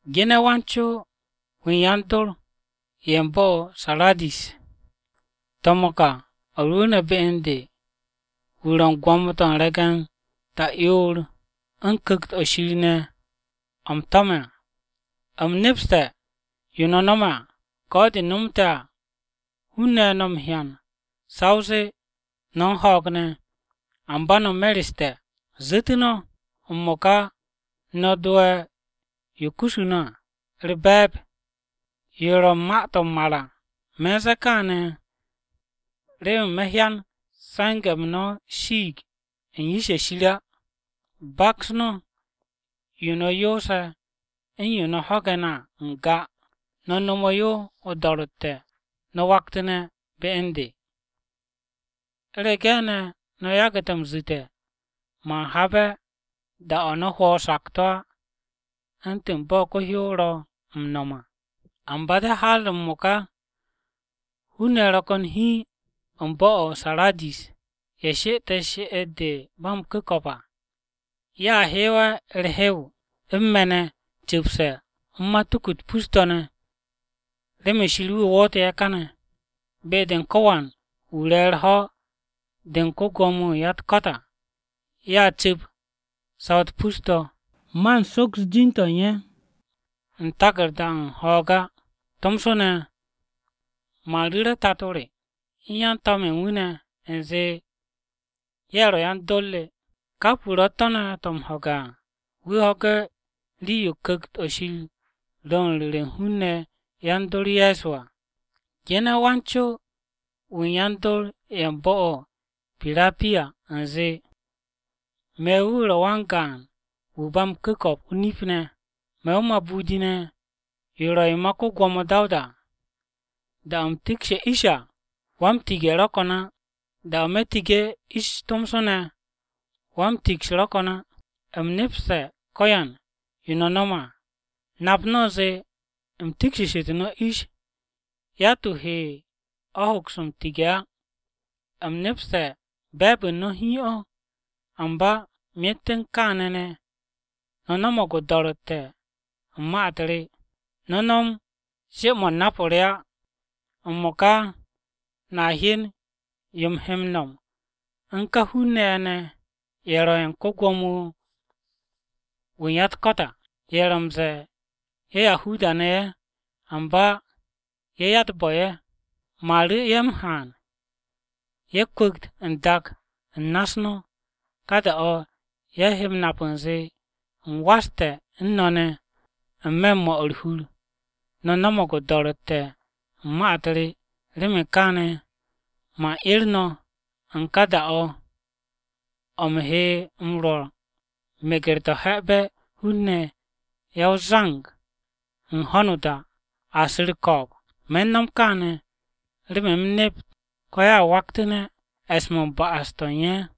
“Gene̱ wan-co-wu̱ u̱n yan-dor ye̱ u̱n bo̱-o̱ o-Saradis: To̱m-o̱ o̱ ka o̱ rwu̱u̱ne̱ be u̱n de, wu̱ ro̱ u̱n gwo̱mo-to̱ u̱n re̱ge̱n ta'yoor u̱n Ku̱kt-o̱ Shir ne̱ o̱ u̱m tome̱ à. U̱m nepste̱ yo no̱ m-nom à. Ko̱ de nomte̱ à hun-ne̱ no̱ m-hyan sa o zee no̱ u̱n ho̱o̱g ne̱, amba no̱ mereste̱. Zu̱te̱ no̱! M-mo̱ka no̱ dowe̱ yo kusu no̱ à u̱r-be̱e̱b, yo ro̱ u̱n ma-to̱ m-mar à. Me̱ u̱n ze̱e̱ kaane̱ remen me̱ hyan se̱nge̱-m no̱ shiig u̱n yish-ye̱ Shir re á. Baks yo no̱ yoose̱ u̱n yo no̱ ho̱ge̱ ne̱ à n-ga. No̱ nomo yo o-do̱ro̱tte̱ no̱ waktu̱ne̱ be u̱n de. U̱rege̱ ne̱ no̱ yagu̱te̱ m-zu̱te̱, man habe̱ da-o̱ no̱ hwo̱ o-sakto̱ á, u̱ntu̱n bo̱ ko-hyow ro̱ m-nom à. Amba de̱ har m-mo̱ka, hun-ne̱ ro̱ ko̱n hiin u̱n bo̱-o̱ o-Saradis ye̱ she'ete̱ she'et-de ba m-ku̱ko̱p à. Ye̱a hewe̱ u̱r-hew u̱n me̱ ne̱ cu̱pse̱ u̱n matuku-u̱t pus-to̱ ne̱, remen Shir wu̱ woote̱ ye̱ káne̱. Be-de u̱n ko̱wan wu̱ re̱ u̱r-ho̱ de u̱n ko-Gwo̱mo-wu̱ u̱n ya-u̱t-ko̱t à, ye̱a cu̱p saw-u̱t pus-to̱. Man soks jin-to̱ u̱n ye̱ u̱n taku̱rda-o̱ u̱n ho̱o̱g á. Tomso ne̱ man ru̱re̱ Tato re u̱n yan-to̱m-ye̱ u̱n wu̱ ne̱ u̱nze ye̱ ro̱ yan-dor re. Kap wu̱ ro̱ u̱t-tó̱ ne̱ to̱ m-ho̱ge̱ à, wu̱ ho̱ge̱ rii-yo Ku̱kt-o Shir ro̱ u̱n ru̱re̱ u̱n hun-ne̱ yan-dor Ye̱so à! “Gene̱ wan-co-wu̱ u̱n yan-dor ye̱ u̱n bo̱-o̱ o-Pirapiya u̱nze: Me̱ wu̱ ro̱ wan-gaan wu̱ ba m-ku̱ko̱p o-nip ne̱. Me̱ o-mabudi ne̱, yo ro̱ yo ma ko-Gwo̱mo Dawuda à. Da-o̱ u̱m tikshe̱ ish à, wa-m-tige̱ ro̱ ko̱n á. Da-o̱ me̱ tige̱ ish tomso ne̱ wa-m-tiks ro̱ ko̱n á. U̱m nepste̱ ko̱yan yo no̱ nome̱ à. Nap u̱nze u̱m tikshitu̱ no̱ ish, yatt-wu̱ he o̱ m-hoks m-tige̱ á. U̱m nepste̱ be̱e̱b u̱n no̱ hiin o̱, amba myet u̱n kááne̱ ne̱ no̱ no̱mo̱g o-do̱ro̱tte̱ u̱n ma-u̱t re, no̱ no̱m she-mo̱ u̱n nap-o re á. M-mo̱ka no̱a hyen yo u̱m he m-nom u̱n ka hun-ne̱ ye̱ ne̱ ye̱ ro̱ ye̱ u̱n ko-Gwo̱mo-wu̱ u̱n ya-u̱t-ko̱t à. Ye̱ ro̱ m-ze̱e̱ ye̱ Yahuda-ne̱ ye̱, amba ye̱ ya-u̱t-bo̱-ye̱. Me̱ u̱n ru̱ ye̱ m-haan ye̱ kwu̱kt n-dak u̱n na-u̱s no̱. Ka da-o̱ ye̱ he m-nap u̱nze, u̱m waste̱ u̱n no̱ ne̱. N-me̱ u̱n 'mo̱ u̱r-hur, no̱ no̱mo̱g o-do̱ro̱tte̱ u̱n ma-u̱t re. Remen kááne̱, man 'er no̱ u̱n ká da-o̱ o̱ u̱m he m-rwo̱ meger-to̱ he̱be̱ hun-ne̱ ya o-zang u̱n ho̱no o-dak a su̱ u̱r-ko̱o̱b. Me̱ u̱n nom kaane̱, remen u̱m nept ko̱ ye̱a waktu̱ne̱ e̱s-mo̱ u̱n ba'as-to̱ u̱n ye̱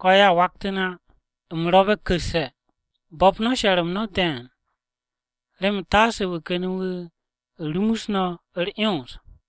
ko̱ ye̱a waktu̱ne̱ á. U̱m ro̱be̱ ku̱sse̱. Bo̱p she̱r-m no̱ de̱e̱n, remen taase wu̱ ken wu̱ rumus no̱ u̱r-'yons.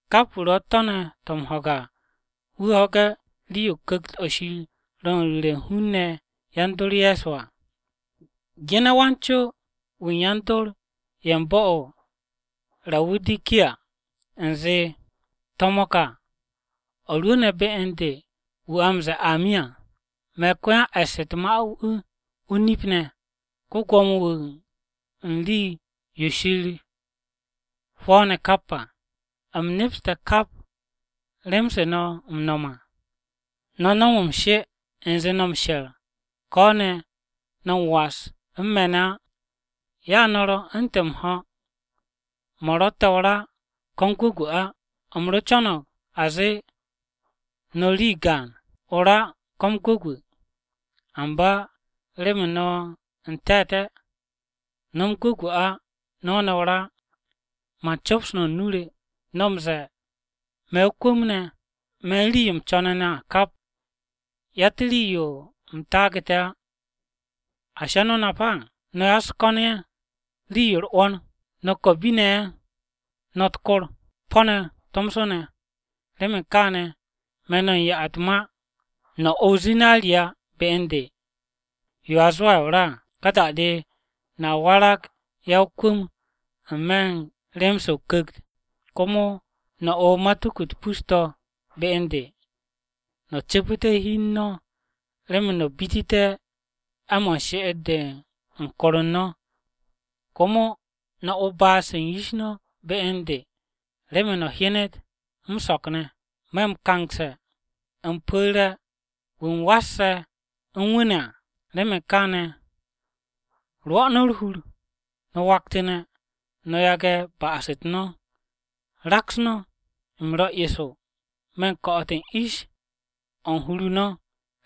Kap wu̱ ro̱ u̱t-tó̱ ne̱ to̱ m-ho̱ge̱ à, wu̱ ho̱ge̱ rii-yo Ku̱kt-o Shir ro̱ u̱n ru̱re̱ u̱n hun-ne̱ yan-dor Ye̱so à! “Gene̱ wan-co-wu̱ u̱n yan-dor ye̱ u̱n bo̱-o̱ o-Rawudikiya u̱nze: To̱m-o̱ ka o̱ rwu̱u̱ne̱ be u̱n de, wu̱ a m-ze̱e̱ ‘Amin’ à. Me̱ ko-yan-e̱ss u̱t-ma wu̱, o-nip ne̱, ko-Gwo̱mo-wu̱ u̱n rii-yo Shir hwo̱o̱ne̱ kap à. U̱m nepste̱ kap rem-se no̱ m-no̱m à, no̱ no̱m m-she u̱nze no̱ m-she̱r ko̱ ne̱ no̱ m-was u̱n me̱ ne̱ á. Ya no̱ ro̱ u̱ntu̱n m-ho̱ mo̱ ro̱tte̱ o-ra ko̱ m-gwu̱gwu̱ á. U̱m ro co̱no̱g a zee no̱ rii gaan, o-ra ko̱ m-gwu̱gwu̱! Amba remen no̱ n-te̱te̱, no̱ m-gwu̱gwu̱ á no̱ ne̱ o-ra á, man cops no̱ u̱n nu-o re! No̱ m-ze̱e̱, ‘Me̱ o-kwu̱m ne̱, me̱ u̱n rii-yo u̱m co̱ne̱ ne̱ à, kap. Yatt rii-yo u̱m taage̱ á!’ ¿Ashi no̱ nap á? No̱ ya-u̱s-ko̱n ye̱, rii-yo u̱r-'wo̱n à, no̱ ko̱bi-ne̱ ye̱, no̱ u̱r-kor, po̱-ne̱ tomso. Remen kaane̱ me̱ no̱ u̱n ya-u̱t-ma no̱ o o-zinariya be u̱n de, yo a zwo̱'e̱ o-ra à. Ka da-de no̱a warag ya-o-kwu̱m n-me̱ u̱n rem-se o-Ku̱kt. Komo no̱ o matuku-u̱t pus-to̱ be u̱n de, no̱ cu̱pu̱te̱ hi u̱n no̱ remen no̱ bitité̱ 'e̱-mo̱ u̱n she'et-de u̱n kor u̱n no̱. Komo no̱ o baat-se u̱n yish no̱ be u̱n de remen no̱ hyenet m-so̱k ne̱. Me̱ m-kangse̱, u̱m pu̱re̱ wu̱ u̱m m-wasse̱ u̱n wu̱ ne̱ à. Remen kaane̱, rwo̱ u̱r-hur, no̱ waktu̱ne̱, no̱ yage̱ ba'as-u̱t no̱. Raks no̱! U̱m ro̱ eso me̱ u̱n ko̱'o̱t u̱n ish-o̱ u̱n hur u̱n no̱.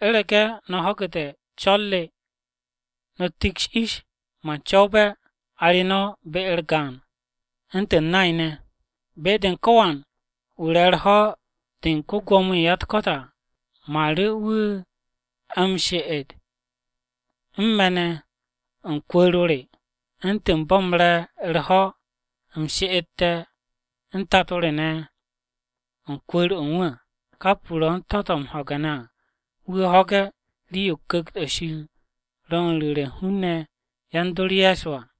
U̱rege̱ no̱ ho̱gu̱te̱ co̱r re no̱ tiks o-ish, man co̱wbe̱ a re be-u̱r gaan u̱ntu̱n nay-ne̱. Be-de u̱n ko̱wan wu̱ re̱ u̱r-ho̱ de u̱n ko-Gwo̱mo-wu̱ u̱n ya-u̱t-ko̱t à, man ru̱ wu̱ wu̱ she'et u̱n me̱ ne̱ u̱n kwu̱u̱r-o re, u̱ntu̱n bo̱ u̱m re̱ u̱r-ho̱, u̱m she'ete̱ u̱n Tato re ne̱ u̱n kwu̱u̱r-o̱ u̱n wu̱ à. Kap wu̱ ro̱ u̱t-tó̱ ne̱ to̱ m-ho̱ge̱ à, wu̱ ho̱ge̱ rii-yo Ku̱kt-o̱ Shir ro̱ u̱n ru̱re̱ u̱n hun-ne̱ yan-dor Ye̱so à!”